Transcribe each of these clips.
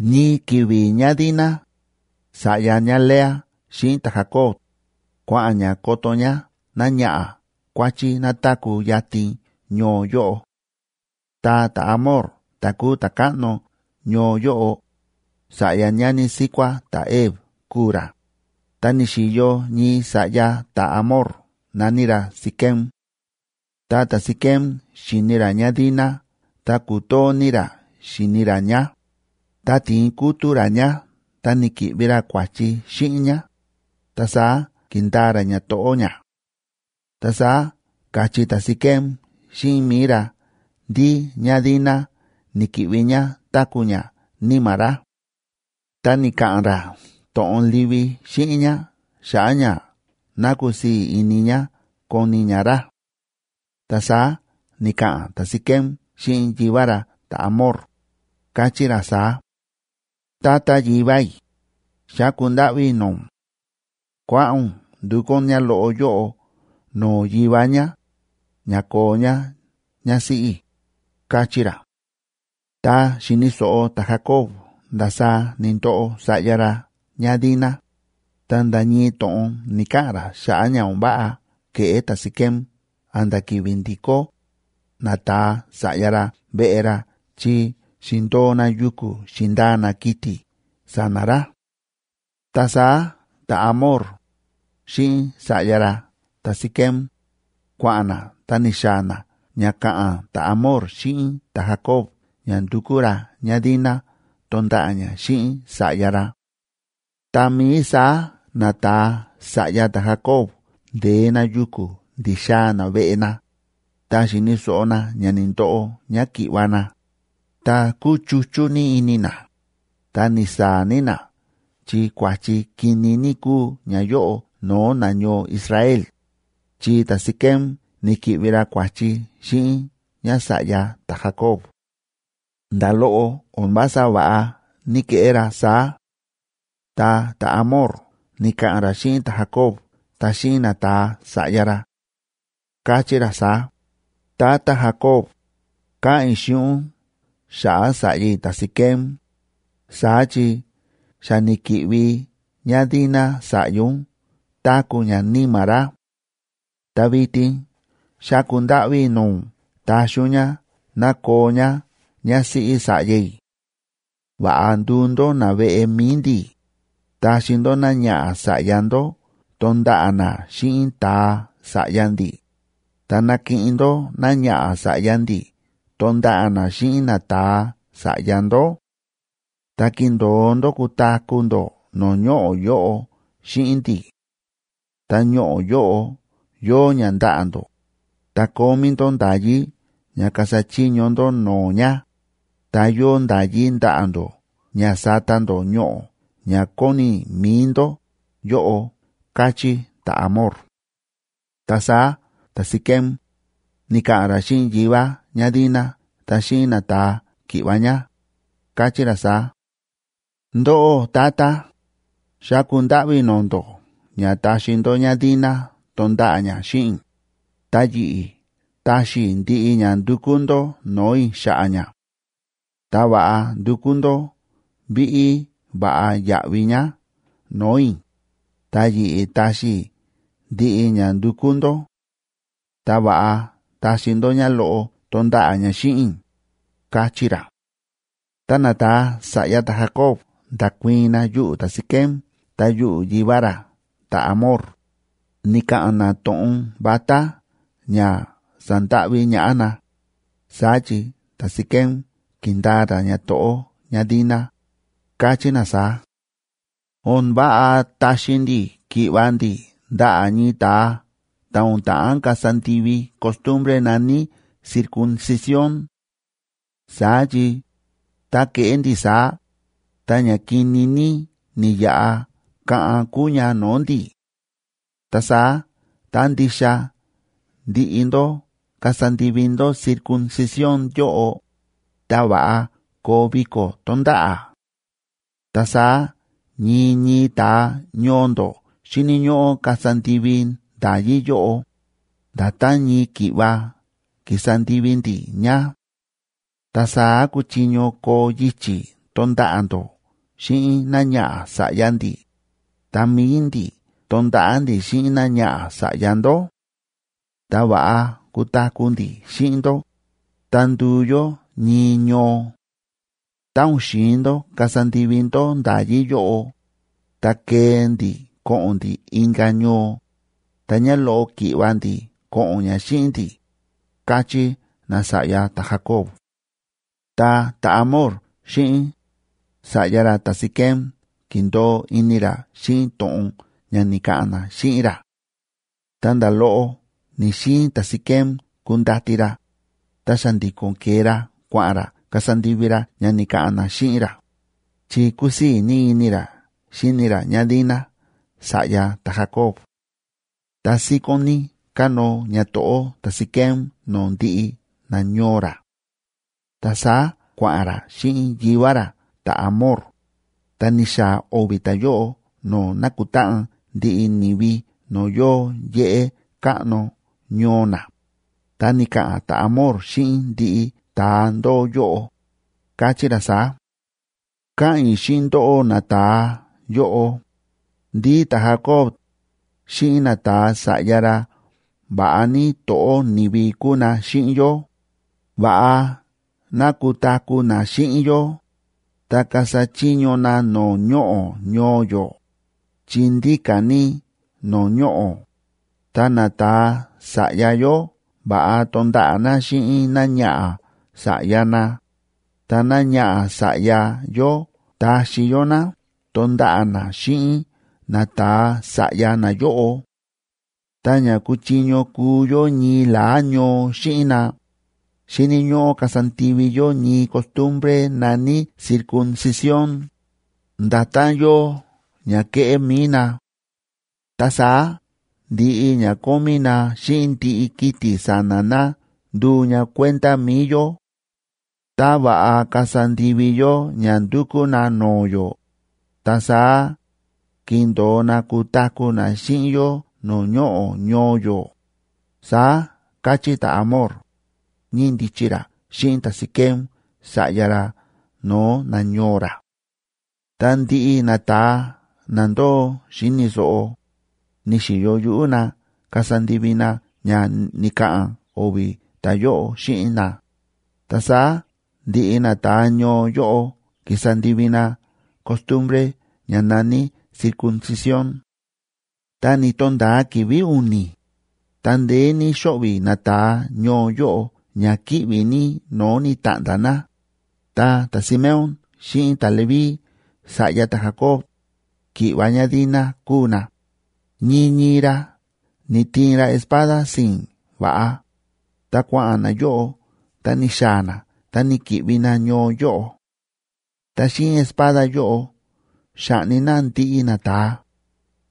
Ñii ki̱vi̱ ñáDina, sa̱ꞌya ñáLea xíꞌin ta̱Jacob, kua̱ꞌa̱n ñá koto ñá náñaꞌa̱ kuáchí ná táku̱ yatin ñoo yóꞌo. Ta ta̱Hamor ta̱ kúu ta̱káꞌno ñoo yóꞌo, sa̱ꞌya ñani síkuá ta̱Hev kúu ra, ta ni̱xi̱yo ñii sa̱ꞌya ta̱Hamor na̱ní ra Siquem. Ta ta̱Siquem xi̱ni ra ñáDina ta kútoo ní ra xíni ra ñá, ta ti̱in kútu̱ ra ñá ta ni̱ki̱ꞌvi ra kua̱chi xíꞌin ñá, ta saá ki̱ndaa ra ñato̱ꞌó ñá. Ta saá ka̱chí ta̱Siquem xíꞌin mi̱i ra ndí ñáDina ni̱ki̱ꞌvi ñá táku̱ ñá níma̱ ra. Ta ni̱ka̱ꞌa̱n ra to̱ꞌon livi xíꞌin ñá xa̱ꞌa̱ ña ná kusii̱ ini ñá koni ñá ra. Ta saá ni̱ka̱ꞌa̱n ta̱Siquem xíꞌin yivá ra ta̱Hamor, káchí ra saá: ―Tata yivá i̱, xáku ndáꞌví i̱ no̱o̱ ún, kuáꞌa̱n ún ndukú ún ñáloꞌo yóꞌo no̱o̱ yivá ñá, ña koo ñá ñásíꞌí i̱ ―káchí ra. Tá xi̱ni̱ so̱ꞌo ta̱Jacob ndasaá ni̱ndoꞌo sa̱ꞌya ra ñáDina, ta nda̱ ñii to̱ꞌon ni̱‑kaꞌa̱n ra xa̱ꞌa̱ ña o̱n váꞌa ke̱ꞌé ta̱Siquem a̱nda̱ ki̱vi̱ ndi̱kó nata̱a sa̱ꞌya ra veꞌe ra, chi xi̱ndo̱o na yuku̱ xi̱ndaa na kiti̱ sa̱na̱ ra. Ta saá ta̱Hamor, xíꞌin sa̱ꞌya ra ta̱Siquem, kua̱ꞌa̱n na ta ni̱xaa̱ na ña ka̱ꞌa̱n ta̱Hamor xíꞌin ta̱Jacob ña ndukú ra ñáDina tonda̱ꞌa̱ ñá xíꞌin sa̱ꞌya ra. Tá mií saá nata̱a sa̱ꞌya ta̱Jacob nde̱e na yuku̱ ndi̱xaa̱ na veꞌe na, ta xi̱ni̱ so̱ꞌo na ña ni̱ndoꞌo ñáki̱ꞌva̱ na, ta kúchuchú ní ini na, ta ni̱saa̱ ní na chi kua̱chi kini ní kúu ñayóꞌo no̱o̱ nañoo Israel, chi ta̱Siquem ni̱ki̱ꞌvi ra kua̱chi xíꞌin ñása̱ꞌya ta̱Jacob. ¡Nda̱ loꞌo o̱n vása va̱ꞌa ni̱keꞌé ra saá! Ta ta̱Hamor ni̱ka̱ꞌa̱n ra xíꞌin ta̱Jacob ta xíꞌin nata̱a sa̱ꞌya ra, káchí ra saá: ―Tata Jacob, káꞌa̱n i̱ xíꞌin ún xa̱ꞌa̱ sa̱ꞌya i̱ ta̱Siquem, saá chi xa ni̱ki̱ꞌvi ñáDina sa̱ꞌya ún táku̱ ñá níma̱ ra. Ta vitin xáku ndáꞌví i̱ no̱o̱ ún taxi ún ñá ná koo ñá ñásíꞌí sa̱ꞌya i̱. Va̱ꞌa nduu ndó naveꞌe mi̱i ndi̱, taxi ndó náñaꞌa̱ sa̱ꞌya ndó tonda̱ꞌa̱ ná xíꞌin ta̱a sa̱ꞌya ndi̱, ta nakiꞌin ndó náñaꞌa̱ sa̱ꞌya ndi̱ tonda̱ꞌa̱ ná xíꞌin nata̱a sa̱ꞌya ndó. Ta kindo̱o ndó kutaku̱ ndó no̱o̱ ñoꞌo̱ yóꞌo xíꞌin ndi̱. Ta ñoꞌo̱ yóꞌo yóo ña ndaꞌa̱ ndó, ta kómí ndó nda̱yí ña kasa chiño ndó no̱o̱ ña, ta yóo nda̱yí ndaꞌa̱ ndó ña sata ndó ñoꞌo̱ ña kóni mi̱i ndó yóꞌo ―káchí ta̱Hamor. Ta saá ta̱Siquem ni̱ka̱ꞌa̱n ra xíꞌin yivá ñáDina ta xíꞌin nata̱a ki̱ꞌva̱ ñá, káchí ra saá: ―Ndóꞌó tata, xáku ndáꞌví i̱ no̱o̱ ndó ña taxi ndó ñáDina tonda̱ꞌa̱ ñá xíꞌin i̱, ta yi̱ꞌi̱ taxi i̱ ndiꞌi ña ndukú ndó no̱o̱ i̱ xa̱ꞌa̱ ñá. Ta va̱ꞌa ndukú ndó víꞌí va̱ꞌa yáꞌvi ñá no̱o̱ i̱, ta yi̱ꞌi̱ taxi i̱ ndiꞌi ña ndukú ndó. Ta va̱ꞌa taxi ndó ñáloꞌo tonda̱ꞌa̱ ñá xíꞌin i̱ ―káchí ra. Ta nata̱a sa̱ꞌya ta̱Jacob nda̱kuii̱n na yuꞌu̱ ta̱Siquem ta yuꞌu̱ yivá ra ta̱Hamor, ni̱ka̱ꞌa̱n na to̱ꞌon vatá ña sandáꞌví ñaꞌá na, saá chi ta̱Siquem ki̱ndaa ra ñato̱ꞌó ñáDina, káchí na saá: ―O̱n váꞌa taxi ndi̱ ki̱ꞌva̱ ndi̱ ndaꞌa̱ ñii ta̱a ta̱ o̱n ta̱ꞌán kasa ndivi costumbre na̱ní circuncisión.a Saá chi tá keꞌé ndi̱ saá, ta ña kini ní ni̱yaꞌa kaꞌan kúu ña no̱o̱ ndi̱. Ta saá tá ndixa ndiꞌi ndó kasa ndivi ndó circuncisión yóꞌo, ta va̱ꞌa koo viko̱ tónda̱ꞌa̱; ta saá ñii ñii ta̱a ñoo ndó xíni̱ ñóꞌó kasa ndivi nda̱yí yóꞌo, nda̱tán ñii ki̱ꞌva ki̱sa ndivi ndi̱ ña. Ta saá kuchiño koo yichi̱ tonda̱ꞌa̱ ndó xíꞌin náñaꞌa̱ sa̱ꞌya ndi̱, ta mi̱i ndi̱ tonda̱ꞌa̱ ndi̱ xíꞌin náñaꞌa̱ sa̱ꞌya ndó; ta va̱ꞌa kutaku̱ ndi̱ xíꞌin ndó, ta nduu yó ñii ñoo. Tá o̱n xi̱in ndó kasa ndivi ndó nda̱yí yóꞌo, ta kee ndi̱ ko̱ꞌo̱n ndi̱ inka̱ ñoo, ta ñáloꞌo ki̱ꞌva̱ ndi̱ ko̱ꞌo̱n ñá xíꞌin ndi̱ ―káchí nasa̱ꞌya ta̱Jacob. Ta ta̱Hamor xíꞌin sa̱ꞌya ra ta̱Siquem ki̱ndo̱o ini ra xíꞌin to̱ꞌon ña ni̱ka̱ꞌa̱n na xíꞌin ra. Ta nda̱ loꞌo ni̱‑xiin ta̱Siquem kundati ra, ta xa̱ndi̱ko̱n ke̱e ra kua̱ꞌa̱n ra kasa ndivi ra ña ni̱ka̱ꞌa̱n na xíꞌin ra, chi kúsii̱ ní ini ra xíni ra ñáDina sa̱ꞌya ta̱Jacob. Ta síkón ní kánóo ñato̱ꞌó ta̱Siquem no̱o̱ ndiꞌi nañoo ra. Ta saá kua̱ꞌa̱n ra xíꞌin yivá ra ta̱Hamor, ta ni̱xaa̱ o̱vi̱ ta̱yóꞌo no̱o̱ nákutáꞌan ndiꞌi ni̱vi no̱o̱ yóo yéꞌé káꞌno ñoo na, ta ni̱ka̱ꞌa̱n ta̱Hamor xíꞌin ndiꞌi ta̱a ndóo yóꞌo, káchí ra saá: ―Káꞌa̱n i̱ xíꞌin ndóꞌó nata̱a yóꞌo, ndí ta̱Jacob xíꞌin nata̱a sa̱ꞌya ra va̱ꞌa ní to̱ꞌó ni̱vi kúu na xíꞌin yó, va̱ꞌa ná kutaku̱ na xíꞌin yó ta kasa chiño na no̱o̱ ñoꞌo̱ ñoo yó, chi ndíka̱ ní no̱o̱ ñoꞌo̱, ta nata̱a sa̱ꞌya yó va̱ꞌa tonda̱ꞌa̱ na xíꞌin náñaꞌa̱ sa̱ꞌya na, ta náñaꞌa̱ sa̱ꞌya yó taxi yó ná tonda̱ꞌa̱ ná xíꞌin nata̱a sa̱ꞌya nayóꞌo. Ta ña kuchiño kuu yó ñii la̱á ñoo xíꞌin na, xíni̱ ñóꞌó kasa ndivi yó ñii costumbre na̱ní circuncisión, nda̱tán yóo ña kéꞌé mi̱i na. Ta saá ndiꞌi ña kómí na xíꞌin ndiꞌi kiti̱ sa̱na̱ na nduu ña kuenda mi̱i yó. Ta va̱ꞌa kasa ndivi yó ña ndúkú na no̱o̱ yó, ta saá kindo̱o na kutaku̱ na xíꞌin yó no̱o̱ ñoꞌo̱ ñoo yó ―saá káchí ta̱Hamor, ñíndichi ra xíꞌin ta̱Siquem sa̱ꞌya ra no̱o̱ nañoo ra. Ta ndiꞌi nata̱a na ndóo xíni̱ so̱ꞌo, ni̱xi̱yo yuꞌú na kasa ndivi na ña ni̱ka̱ꞌa̱n o̱vi̱ ta̱yóꞌo xíꞌin na, ta saá ndiꞌi nata̱a ñoo yóꞌo ki̱sa ndivi na costumbre ña na̱ní circuncisión. Ta ni̱to̱nda̱a ki̱vi̱ u̱ni̱, ta ndeé ní xóꞌvi̱ nata̱a ñoo yóꞌo ña kíꞌvi̱ ní no̱o̱ ni̱ta̱ꞌnda̱ na, ta ta̱Simeón xíꞌin ta̱Leví, sa̱ꞌya ta̱Jacob, ki̱ꞌva̱ ñáDina kúu na, ñii ñii ra ni̱tiin ra espada si̱i̱n va̱ꞌa, ta kua̱ꞌa̱n nayóꞌo ta ni̱xaa̱ na ta ni̱ki̱ꞌvi na ñoo yóꞌo. Ta xíꞌin espada yóꞌo xa̱ꞌni na ndiꞌi nata̱a,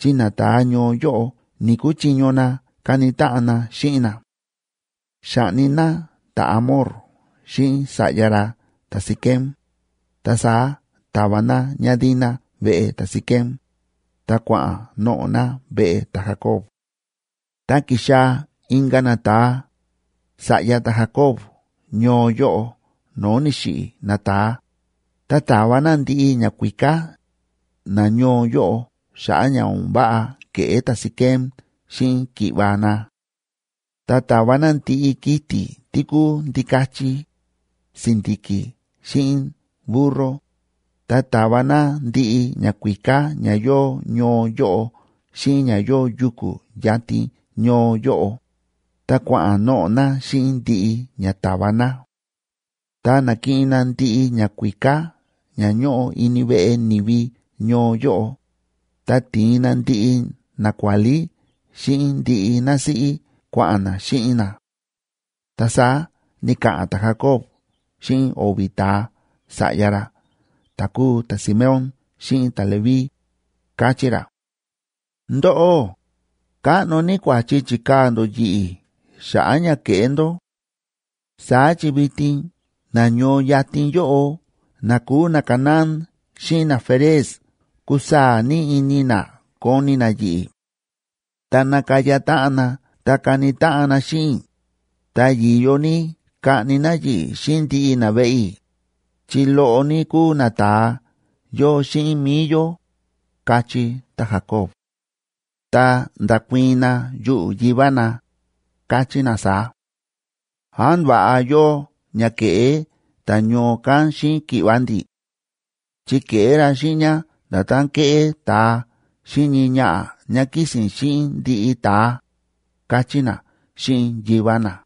chi nata̱a ñoo yóꞌo ni̱‑kuchiño na kani táꞌan na xíꞌin na. Xa̱ꞌni na ta̱Hamor xíꞌin sa̱ꞌya ra ta̱Siquem, ta saá ta̱va na ñáDina veꞌe ta̱Siquem, ta kua̱ꞌa̱n noꞌo̱ na veꞌe ta̱Jacob. Ta ki̱xaa̱ inka̱ nata̱a sa̱ꞌya ta̱Jacob ñoo yóꞌo no̱o̱ ni̱xiꞌi̱ nata̱a, ta ta̱va na ndiꞌi ñakuíká nañoo yóꞌo xa̱ꞌa̱ ña o̱n váꞌa ke̱ꞌé ta̱Siquem xíꞌin ki̱ꞌva̱ na. Ta ta̱va na ndiꞌi kiti̱ tí kúu ndikachi, si̱ndi̱ki̱, xíꞌin burro, ta ta̱va na ndiꞌi ñakuíká ña yóo ñoo yóꞌo xíꞌin ña yóo yuku̱ yatin ñoo yóꞌo, ta kua̱ꞌa̱n noꞌo̱ na xíꞌin ndiꞌi ña ta̱va na. Ta na̱kiꞌin na ndiꞌi ñakuíká ña ñóꞌo ini veꞌe ni̱vi ñoo yóꞌo, ta ti̱in na ndiꞌi nakuálí xíꞌin ndiꞌi násíꞌí kua̱ꞌa̱n na xíꞌin na. Ta saá ni̱ka̱ꞌa̱n ta̱Jacob xíꞌin o̱vi̱ ta̱a sa̱ꞌya ra ta̱ kúu ta̱Simeón xíꞌin ta̱Leví, káchí ra: ―Ndóꞌó, káꞌno ní kua̱chi chi̱kaa̱ ndó yi̱ꞌi̱ xa̱ꞌa̱ ña ke̱ꞌé ndó. Saá chi vitin na ñoo yatin yóꞌo na kúu naCanaán xíꞌin naFerez kusaa̱ ní ini na koni na yi̱ꞌi̱. Tá nakaya táꞌan na ta kani táꞌan na xíꞌin i̱, ta yi̱yo ní kaꞌni na yi̱ꞌi̱ xíꞌin ndiꞌi naveꞌe i̱, chi loꞌo ní kúu nata̱a yóo xíꞌin mi̱i yó ―káchí ta̱Jacob. Ta nda̱kuii̱n na yuꞌu̱ yivá na, káchí na saá: ―¿Án va̱ꞌa yóo ña ke̱ꞌé ta̱ ñoo kán xíꞌin ki̱ꞌva̱ ndi̱?, chi ke̱ꞌé ra xíꞌin ñá nda̱tán kéꞌé ta̱a xíꞌin ñii ñaꞌa̱ ñá kísi̱n xíꞌin ndiꞌi ta̱a ―káchí na xíꞌin yivá na.